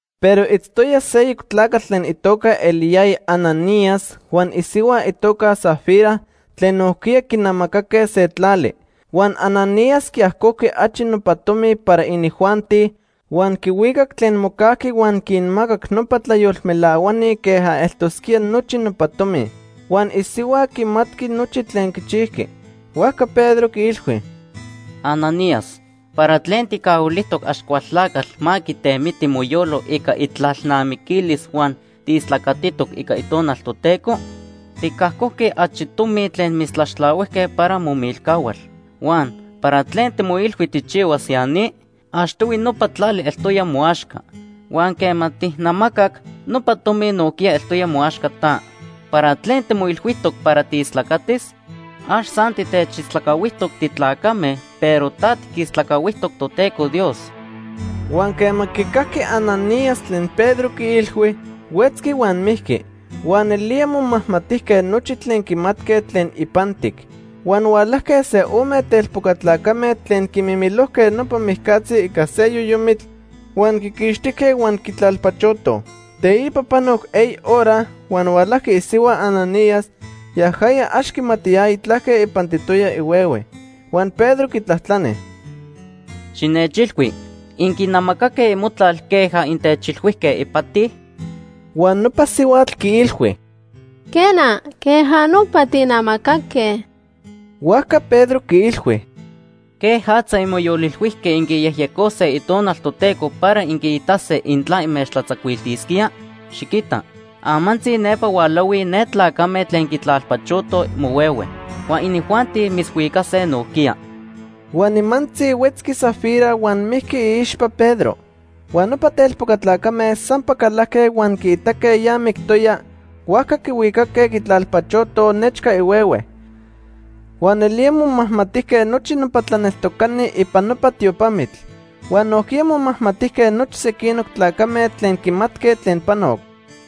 Pero itztoya seyoc tlacatl tlen itoca eliyaya Ananías huan isihua itoca Safira tlen nojquiya quinamacaque se tlali. Huan Ananías quiajcojqui achi nopa tomi para inijuanti, huan quihuicac tlen mocajqui huan quinmacac nopa tlayolmelahuani queja eltosquía nochi nopa tomi. Huan isihua quimatqui nochi tlen quichijqui. Huajca Pedro quiilhui: ―Ananías, ¿para tlen tijcahuilijtoc Axcualtlacatl ma quitemiti moyolo ica itlalnamiquilis huan tiistlacatitoc ica Itonal Toteco? Ticajcojqui achi tomi tlen mitztlaxtlahuijque para momilcahual. Huan ¿para tlen timoilhui tijchihuas ya ni? Achtohui nopa tlali eltoya moaxca. Huan quema tijnamacac, nopa tomi nojquiya eltoya moaxca ta. ¿Para tlen timoilhuijtoc para tiistlacatis? Ax san titechistlacahuijtoc titlacame, pero ta tiquistlacahuijtoc Toteco Dios. Huan quema quicajqui Ananías tlen Pedro quiilhui, huetzqui huan mijqui. Huan nelía momajmatijque nochi tlen quimatque tlen ipantic. Huan hualajque se ome telpoca tlacame tlen quiquimilojque nopa mijcatzi ica se yoyomitl, huan quiquixtijque huan quitlalpachotoj. Teipa panoc eyi hora huan hualajqui isihua Ananías. Yajaya ax quimatiyaya tlaque ipantitoya ihuehue. Huan Pedro quitlajtlani: ―Xinechilhui, ¿inquinamacaque imotlal queja intechilhuijque ipati? Huan nopa sihuatl quiilhui: ―Quena, queja nopa tijnamacaque. Huajca Pedro quiilhui: ―¿Quejatza inmoyolilhuijque inquiyejyecose Itonal Toteco para inquiitase intla inmechtlatzacuiltisquía? Xiquita, amantzi nepa hualahuij ne tlacame tlen quitlalpachotoj mohuehue. Huan inijuanti mitzhuicase nojquiya. Huan nimantzi, huetzqui Safira huan mijqui iixpa Pedro. Huan nopa telpoca tlacame sampa calajque huan quiitaque ya mictoya, huajca quihuicaque quitlalpachotoj nechca ihuehue. Huan nelía momajmatijque nochi nopa tlaneltocani ipan nopa tiopamitl. Huan nojquiya momajmatijque nochi sequinoc tlacame tlen quimatque tlen panoc.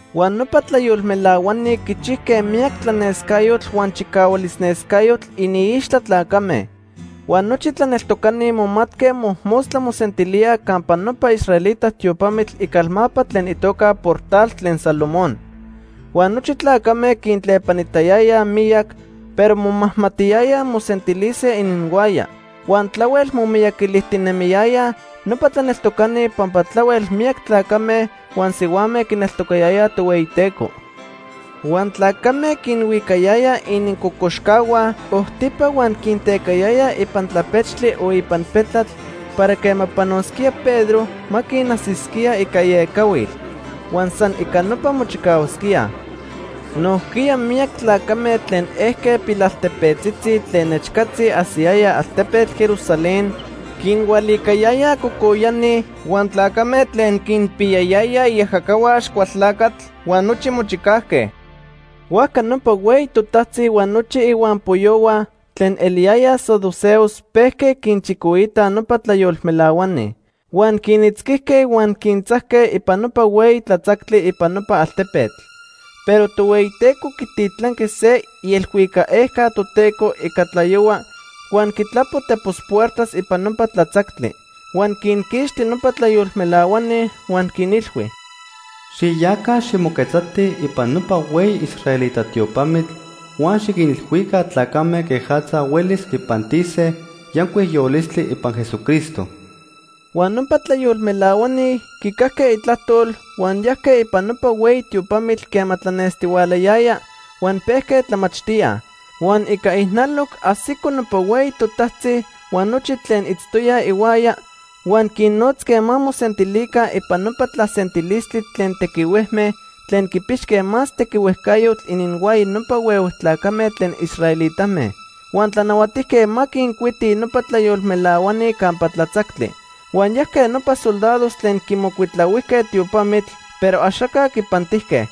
Huan nopa tlayolmelahuani quichijque miyac tlanescayotl huan chicahualnescayotl iniixtla tlacame. Huan nochi tlaneltocani momatque mojmostla mosentilíaj campa nopa israelita tiopamitl icalmapa tlen itoca Portal tlen Salomón. Huan nochi tlacame quintlepanitayayaj miyac, pero momajmatiyayaj mosentilise ininhuaya. Huan tlahuel momiyaquilijtinemiyayaj nopa tlaneltocani pampa tlahuel miyac tlacame huan sihuame quineltocayayaj Tohueyiteco. Huan tlacame quinhuicayayaj inincocoxcahua ojtipa huan quintecayayaj ipan tlapechtli o ipan petlatl para quema panosquía Pedro, ma quinajsisquía ica iecahuil. Huan san ica nopa mochicahuasquíaj. Nojquiya miyac tlacame tlen ejque pilaltepetzitzi tlen nechcatzi ajsiyayaj altepetl Jerusalén, quinhualicayayaj cocoyani, huan tlacame tlen quinpiyayayaj iajacahua Axcualtlacatl huan nochi mochicajque. Huajca nopa hueyi totajtzi huan nochi ihuampoyohua tlen eliyayaj saduceos pejque quinchicoitaj nopa tlayolmelahuani. Huan quinitzquijque huan quintzajque ipan nopa hueyi tlatzactli ipan nopa altepetl. Pero Tohueyiteco quititlanqui se ielhuicac ejca Toteco ica tlayohua huan quitlapo tepos puertas ipan nopa tlatzactli. Huan quinquixti nopa tlayolmelahuani huan quinilhui: “Xiyaca ximoquetzatij ipan nopa hueyi israelita tiopamitl huan xiquinilhuica tlacame quejatza huelis quipantise yancuic yolistli ipan Jesucristo.” Huan nopa tlayolmelahuani quicajque itlajtol huan yajque ipan nopa hueyi tiopamitl quema tlanestihualayaya, huan pejque tlamachtíaj. Huan ica ijnaloc ajsico nopa hueyi totajtzi huan nochi tlen itztoyaj ihuaya, huan quinnotzque ma mosentilica ipan nopa tlasentilistli tlen tequihuejme tlen quipixque más tequihuejcayotl ininhuaya nopa huehue tlacame tlen israelitame. Huan tlanahuatijque ma quincuitij nopa tlayolmelahuani campa tlatzactli. Huan yajque nopa soldados tlen quimocuitlahuijque tiopamitl, pero axaca quipantijque.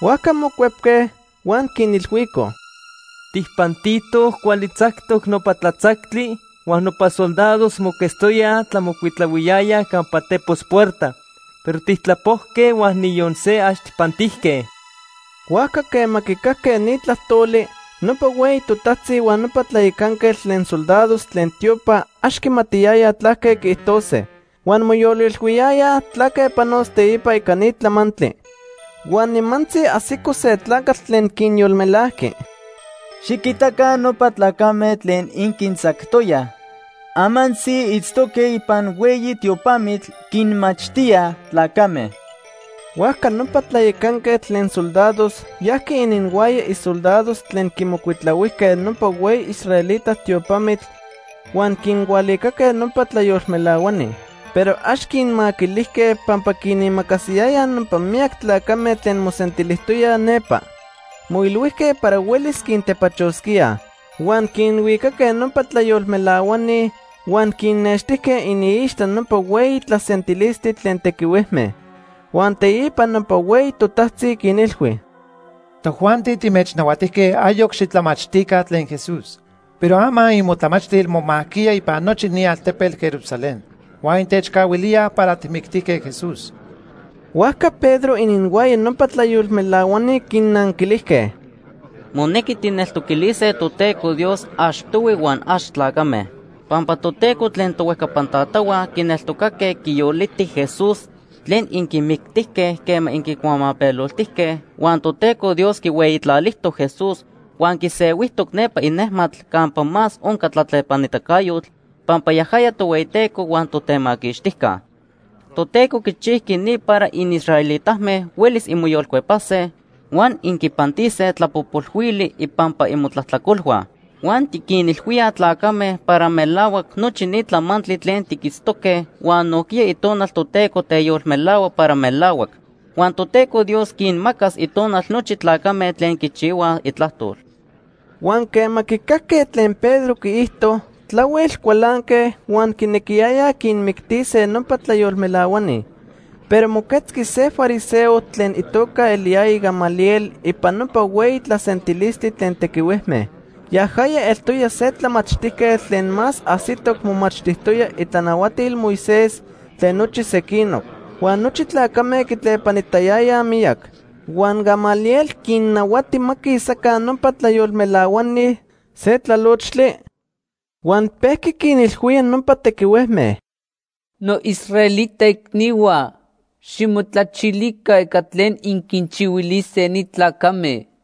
Huajca mocuepque, huan quinilhuicoj: ―Tijpantitoj cuali tzactoc nopa tlatzactli, huan nopa soldados moquetztoyaj tlamocuitlahuijtoyaj campa tepos puerta, pero tijtlapojque huan niyon se ax tijpantijque. Huajca quema quicajque ni tlajtoli, nopa hueyi totajtzi huan nopa tlayacanquetl tlen soldados tlen tiopa ax quimatiyayaj tlaque quiijtose. Huan moyolilhuiyayaj tlaque panos teipa ica ni tlamantli. Huan nimantzi ajsico se tlacatl tlen quinyolmelajqui: ―Xiquitaca nopa tlacame tlen inquintzactoyaj, amantzi itztoque ipan hueyi tiopamitl, quinmachtíaj tlacame. Huajca nopa tlayacanquetl tlen soldados yajqui ininhuaya isoldados tlen quimocuitlahuijque nopa hueyi israelita tiopamitl huan quinhualicaque nopa tlayolmelahuani. Pero ax quinmaquilijque pampa quinimacasiyayaj nopa miyac tlacame tlen mosentilijtoyaj nepa. Moilhuijque para huelis quintepachosquíaj. Huan quinhuicaque nopa tlayolmelahuani huan quinnextijque iniixtla nopa hueyi tlasentilistli tlen tequihuejme. Huan teipa nopa hueyi totajtzi quinilhui: ―Tojuanti timechnahuatijque ayoc xitlamachtica tlen Jesús. Pero ama imotlamachtil momajquiya ipan nochi ni altepetl Jerusalén. Huan intechcahuilíaj para tijmictijque Jesús. Huajca Pedro ininhuaya nopa tlayolmelahuani quinnanquilijque: ―Monequi tijneltoquilise Toteco Dios achtohui huan ax tlacame. Pampa Toteco tlen tohuejcapan tatahua quineltocaque quiyoliti Jesús tlen inquimictijque quema inquicuamapeloltijque, Huan Toteco Dios quihueyitlalijtoc Jesús huan quisehuijtoc nepa inejmatl campa más onca tlatlepanitacayotl pampa yajaya Tohueyiteco huan Totemaquixtijca. Toteco quichijqui ni para inisraelitame huelis inmoyolcuepase huan inquipantise tlapojpolhuili ipampa imotlajtlacolhua. Huan tiquinilhuíaj tlacame para melahuac nochi ni tlamantli tlen tiquitztoque huan nojquiya Itonal Toteco teyolmelahua para melahuac. Huan Toteco Dios quinmacas Itonal nochi tlacame tlen quichihuaj itlajtol. Huan quema quicajque tlen Pedro quiijto, tlahuel cualanque, huan quinequiyayaj quinmictise nopa tlayolmelahuani. Pero moquetzqui se fariseo tlen itoca eliyaya Gamaliel ipan nopa hueyi tlasentilistli tlen tequihuejme. Yajaya eltoya se tlamachtijquetl tlen más ajsitoc momachtijtoya itlanahuatil Moisés tlen nochi sequinoc; huan nochi tlacame quitlepanitayayaj miyac. Huan Gamaliel quinnahuati ma quisaca nopa tlayolmelahuani se tlalochtli, huan pejqui quinilhuía nopa tequihuejme: ―Noisraelita icnihua, ximotlachilica ica tlen inquinchihuilise ni tlacame.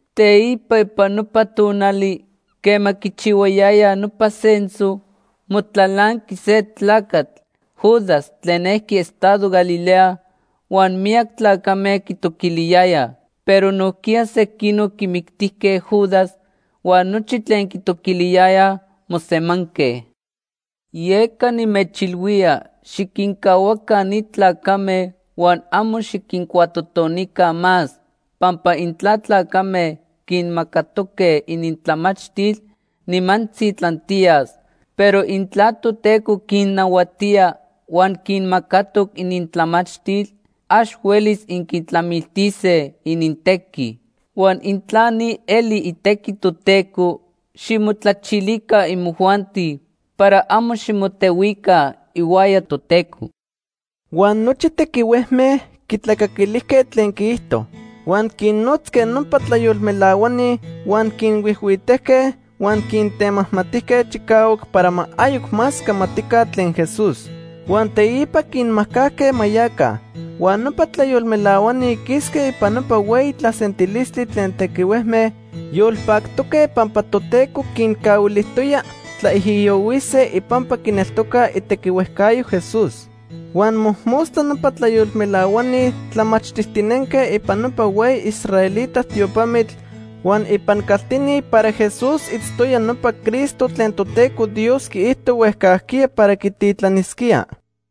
Teipa ipan nopa tonali quema quichihuayayaj nopa censo, motlalanqui se tlacatl Judas tlen ejqui estado Galilea, huan miyac tlacame quitoquiliyayaj. Pero nojquiya sequinoc quimictijque Judas, huan nochi tlen quitoquiliyayaj mosemanque. Yeca nimechilhuía, xiquincahuaca ni tlacame huan amo xiquincuatotonica más, pampa intla tlacame quinmacatoque inintlamachtil, nimantzi tlantiyas. Pero intla Toteco quinnahuatía huan quinmacatoc inintlamachtil, ax huelis inquitlamiltise inintequi. Huan intla ni eli itequi Toteco, ximotlachilica imojuanti para amo ximotehuica ihuaya Toteco. Huan nochi tequihuejme quitlacaquilijque tlen quiijto. Huan quinnotzque nopa tlayolmelahuani huan quinhuijhuitejque huan quintemajmatijque chicahuac para ma ayoc más camatica tlen Jesús. Huan teipa quinmajcajque ma yaca. Huan nopa tlayolmelahuani quisque ipan nopa hueyi tlasentilistli tlen tequihuejme yolpactoque pampa Toteco quincahuilijtoya tlaijiyohuise ipampa quineltocaj itequihuejcayo Jesús. Huan mojmostla nopa tlayolmelahuani tlamachtijtinenque ipan nopa hueyi israelita tiopamitl huan ipan caltini para Jesús itztoya nopa Cristo tlen Toteco Dios quiijto huejcajquiya para quititlanisquía.